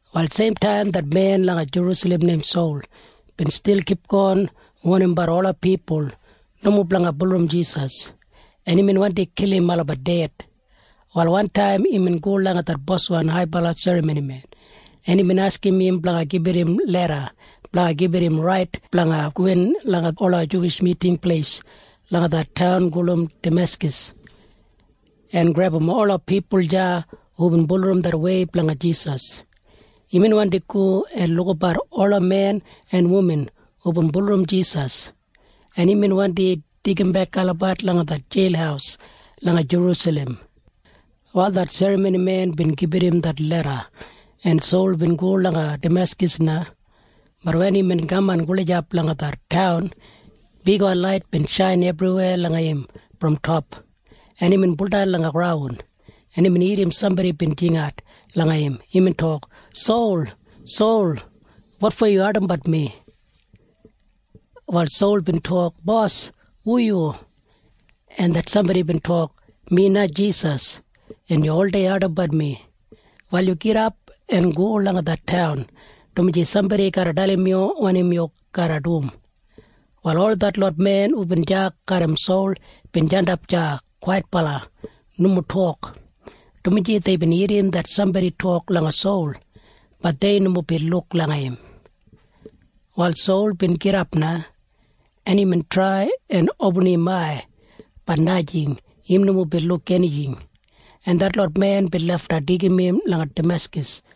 Wal seimtaim det men langa Jerusalem neim Sol bin stil kipgon wonimbat ola pipul nomo blanga bulurrum Jisas, en imbin wandi kilim olabat ded. Wal wantaim imbin go langa det boswan haibala serramonimen, en imbin askim im blanga gibit im leda blanga gibit im rait blanga gowin langa ola Juwish Miting Pleis langa det taun gulum Dameskas en grebum ola pipul deya hubin bulurrum det wei blanga Jisas. Imbin wandi go en lukabat ola men en wuman hubin bulurrum Jisas, en imbin wandi deigimbek olabat langa det jeil langa Jerusalem. Wal det serramonimen bin gibit im det leda, en Sol bin go langa Dameskas na. Bat wen imbin kaman gulijap langa det taun, bigwan lait bin shain ebriwei langa im brom top, en imbin buldan langa graun, en imbin irrim sambodi bin jingat langa im. Imbin tok, “Sol, Sol, wotfo yu ardimbat mi?” Wal Sol bin tok, “Bos, hu yu?” En det sambodi bin tok, “Mi na Jisas, en yu oldei ardimbat mi. Wal yu gidap en go langa det taun, dumaji sambodi garra dalim yu wanim yu garra dum.” Wal ol detlot men hubin deya garram Sol bin jandap deya kwaitbala nomo tok, dumaji deibin irrim det sambodi tok langa Sol. Bat dei nomo bin luk langa im. Wal Sol bin gidap na, en imbin trai en opinim im ai. Bat najing. Im nomo bin luk enijing, en detlot men bin lafta deigim im langa Dameskas,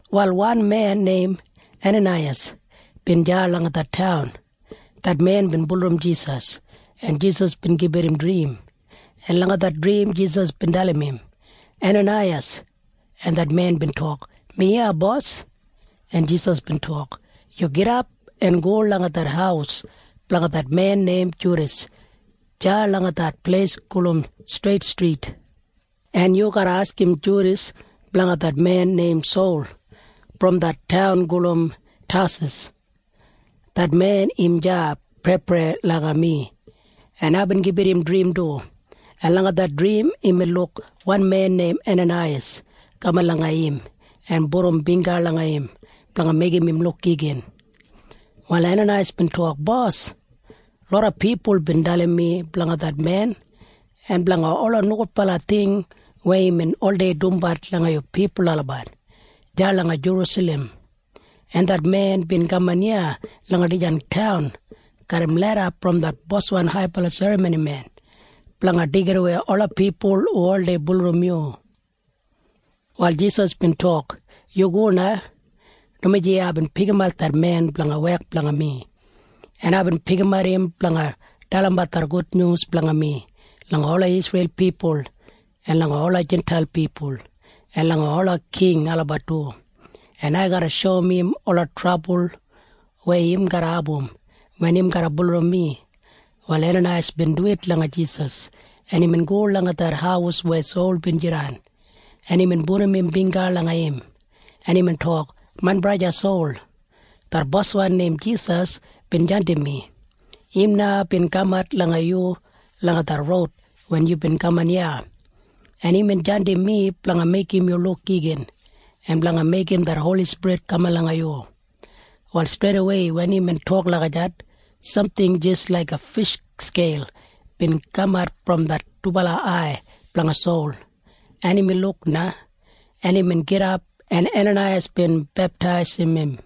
Wal wan men neim Enanaiyas bin deya langa det taun. Det men bin bulurrum Jisas, en Jisas bin gibit im drim, en langa det drim Jisas bin dalim im, “Enanaiyas!” En Enanaiyas bin ensarim im, “Mi iya, Bos.” En Jisas bin tok, “Yu gidap en go langa det haus blanga det men neim Judas deya langa det pleis gulum Streit Strit, en yu garra askim Judas blanga det men neim Sol brom det taun gulum Tasas. Det men im deya preiprei langa mi, en aibin gibit im drim du, en langa det drim imbin luk wan men neim Enanaiyas kaman langa im en pudum bingga langa im blanga meigim im luk igin.” Wal Enanaiyas bin tok, “Bos, loda pipul bin dalim mi blanga det men en blanga ola nogudbala ting weya imbin oldei dumbat langa yu pipul olabat deya langa Jerusalem, en det men bin kaman iya langa dijan taun garram leda brom det boswan haibala serramonimen blanga deigidawei ola pipul hu oldei bulurrum yu.” Wal Jisas bin tok, “Yu go na, dumaji aibin pikimat det men blanga wek blanga mi, en aibin pikimat im blanga dalimbat det gudnyus blanga mi langa ola Isreil pipul en langa ola Jintail pipul en langa ola king olabat du, en ai garra shoum im ola trabul weya im garra abum wen im garra bulurrum mi.” Wal Enanaiyas bin duwit langa Jisas, en imbin go langa det haus weya Sol bin jidan, en imbin pudum im bingga langa im, en imbin tok, “Main braja Sol, det Boswan neim Jisas bin jandim mi. Im na bin kamat langa yu langa det roud wen yubin kaman iya, en imbin jandim mi blanga meigim yu luk igin en blanga meigim det Holi Spirit kaman langa yu.” Wal streidawei wen imbin tok lagijat, samting jis laiga fish skeil bin kamat brom det dubala ai blanga Sol, en imbin luk na, en imbin gidap, en Enanaiyas bin beptaisim im,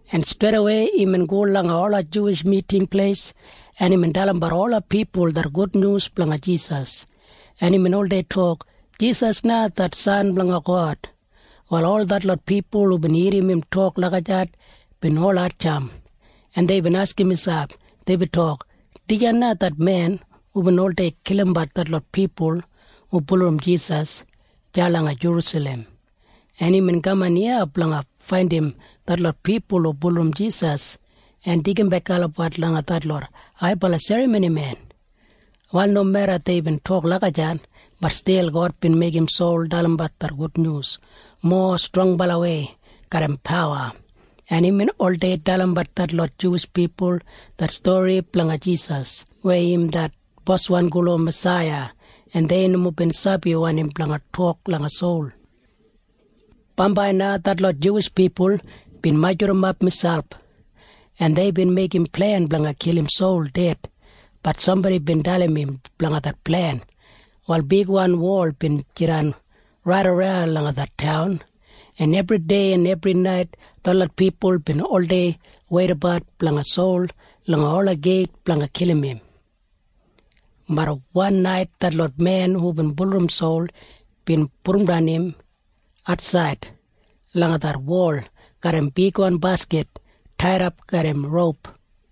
en streidawei imbin go langa ola Juwish Miting Pleis, en imbin dalimbat ola pipul det gudnyus blanga Jisas, en imbin oldei tok, “Jisas na det San blanga God.” Wal ol detlot pipul hubin irrim im tok lagijat bin ol hatjamp, en deibin askim miselp. Deibin tok, “Dijan na det men hubin oldei kilimbat detlot pipul hu bulurrum Jisas deya langa Jerusalem, En imbin kaman iya blanga faindim detlot pipul hu bulurrum Jisas en deigimbek olabat langa detlot haibala serramonimen.” Wal nomeda deibin tok lagijat, bat stil God bin meigim Sol dalimbat det gudnyus mowa strongbalawei garram pawa, en imbin oldei dalimbat detlot Juwish pipul det stori blanga Jisas weya im det Boswan gulum Masaiya. En dei nomo bin sabi wanim blanga tok langa Sol. Bambai na detlot Juwish pipul bin majurrumap miselp, en deibin meigim plen blanga kilim Sol ded. Bat sambodi bin dalim im blanga det plen. Wal bigwan wol bin jidan raidaran langa det taun, en ebridei en ebrinait detlot pipul bin oldei weidabat blanga Sol langa ola geit blanga kilim im. Bat wan nait detlot men hubin bulurrum Sol bin pudumdan im atsaid langa det wol garram bigwan baskit taidap garram roup.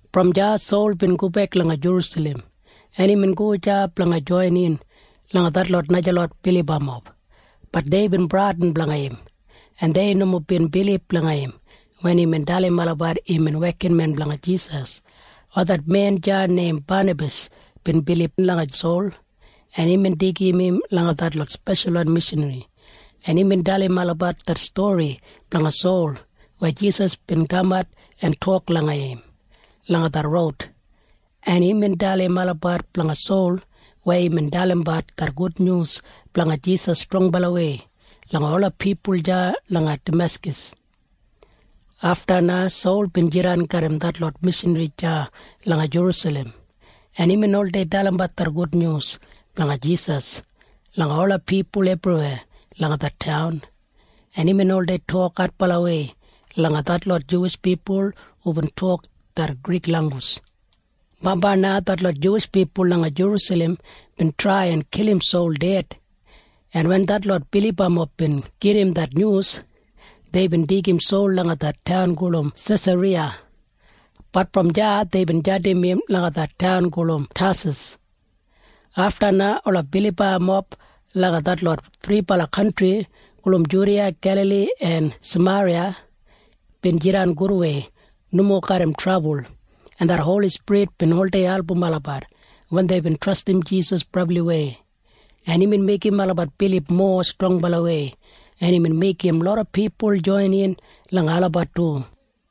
Brom deya Sol bin gobek langa Jerusalem, en imbin go deya blanga joinin langa detlot najalot bilibamob. Bat deibin bradin blanga im, en dei nomo bin bilib langa im wen imbin dalim olabat imbin wekinmen blanga Jisas. Wal det men deya neim Banabas bin bilib langa Sol, en imbin deigim im langa detlot speshalwan mishanri, en imbin dalim olabat det stori blanga Sol weya Jisas bin kamat en tok langa im langa det roud, en imbin dalim olabat blanga Sol weya imbin dalimbat det gudnyus blanga Jisas strongbalawei langa ola pipul deya langa Dameskas. Afta na Sol bin jidan garram detlot mishanri deya langa Jerusalem, en imbin oldei dalimbat det gudnyus blanga Jisas langa ola pipul ebriweya langa det taun, en imbin oldei tok adbalawei langa detlot Juwish pipul hubin tok det Grik langgus. Bambai na detlot Juwish pipul langa Jerusalem bin trai en kilim Sol ded, en wen detlot bilibamob bin gedim det nyus, deibin deigim Sol langa det taun gulum Sesariya, bat brom deya deibin jandim im langa det taun gulum Tasas. Afta na ola bilibamob langa detlot thribala kantri gulum Judiya, Gelali en Sameriya bin jidan gudwei nomo garram trabul, en det Holi Spirit bin oldei album olabat wen deibin trastim Jisas brabliwei, en imbin meigim olabat bilib mowa strongbalawei, en imbin meigim loda pipul joinin langa olabat du.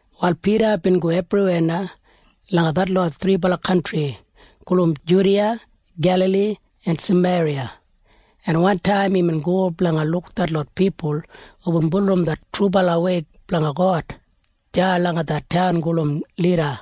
Wal Pida bin go ebriweya na langa detlot thribala kantri gulum Judiya, Gelali en Sameriya, en wantaim imbin go blanga luk detlot pipul hubin bulurrum det trubala wei blanga God deya langa det taun gulum Lida,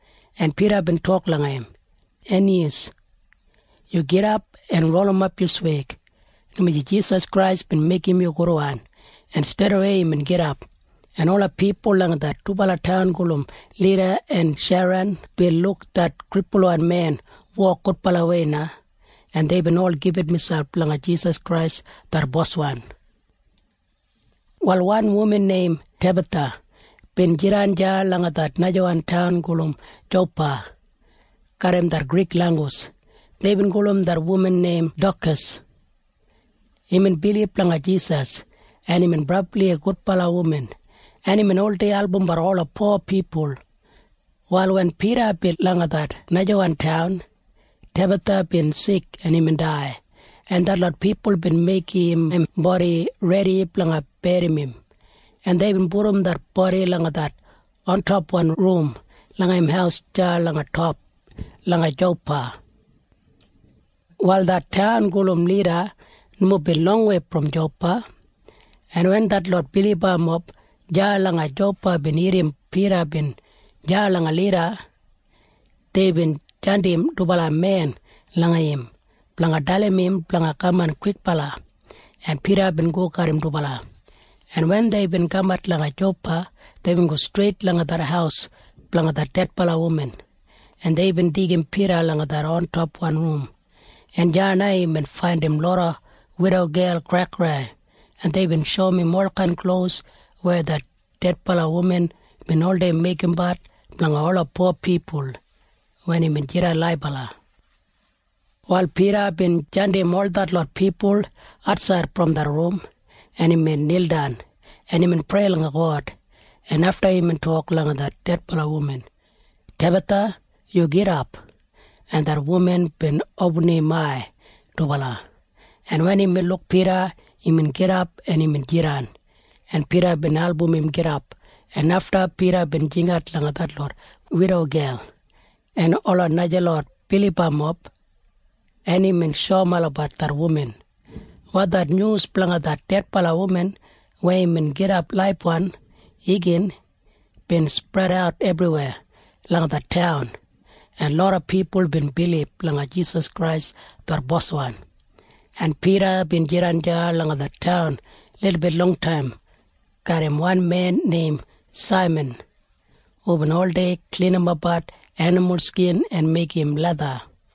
en Pida bin tok langa im, “Aniyas, yu gidap en rolimap yu sweig, dumaji Jisas Krais bin meigim yu gudwan.” En streidawei imbin gidap, en ola pipul langa det dubala taun gulum Lida en Sheran bin luk det kripulwan men wok gudbalawei na, en deibin ol gibit miselp langa Jisas Krais det Boswan. Wal wan wuman neim Tebatha bin jidan deya langa det najawan taun gulum Jopa. Garram det Grik langgus deibin gulum det wuman neim Dokas. Imbin bilib langa Jisas, en imbin brabli gudbala wuman, en imbin oldei albumbat ola po pipul. Wal wen Pida bin langa det najawan taun, Tebatha bin sik en imbin dai, en detlot pipul bin meigim im bodi redi blanga berrim im, en deibin pudum det bodi langa det ontopwan rum langa im haus deya langa Jopa. Wal det taun gulum Lida nomo bin longwei brom Jopa, en wen detlot bilibamob deya langa Jopa bin irrim Pida bin deya langa Lida, deibin jandim dubala men langa im blanga dalim im blanga kaman kwikbala, en Pida bin go garram dubala, en wen deibin kamat langa Jopa, deibin go streit langa det haus blanga det dedbala wuman, en deibin deigim Pida langa det ontopwan rum, en deya na imbin faindim loda widogel kraikrai, en deibin shoum im olkain klos weya det dedbala wuman bin oldei meigimbat blanga ola po pipul wen imbin jidan laibala. Wal Pida bin jandim ol detlot pipul atsaid brom det rum, en imbin nildan, en imbin prei langa God, en afta imbin tok langa det dedbala wuman, “Tebatha, yu gidap.” En det wuman bin opinim im ai dubala, en wen imbin luk Pida, imbin gidap en jidan, en Pida bin album im jandap, en afta Pida bin jingat langa detlot widogel en ola najalot bilibamob, en imbin shoum olabat det wuman. Wal det nyus blanga det dedbala wuman weya bin gidap laibwan igin bin spredat ebriweya langa det taun, en loda pipul bin bilib langa Jisas Krais det Boswan, en Pida bin jidan deya langa det taun lilbit longtaim garram wan men neim Saiman hubin oldei klinimbat enimul skin en meigim letha.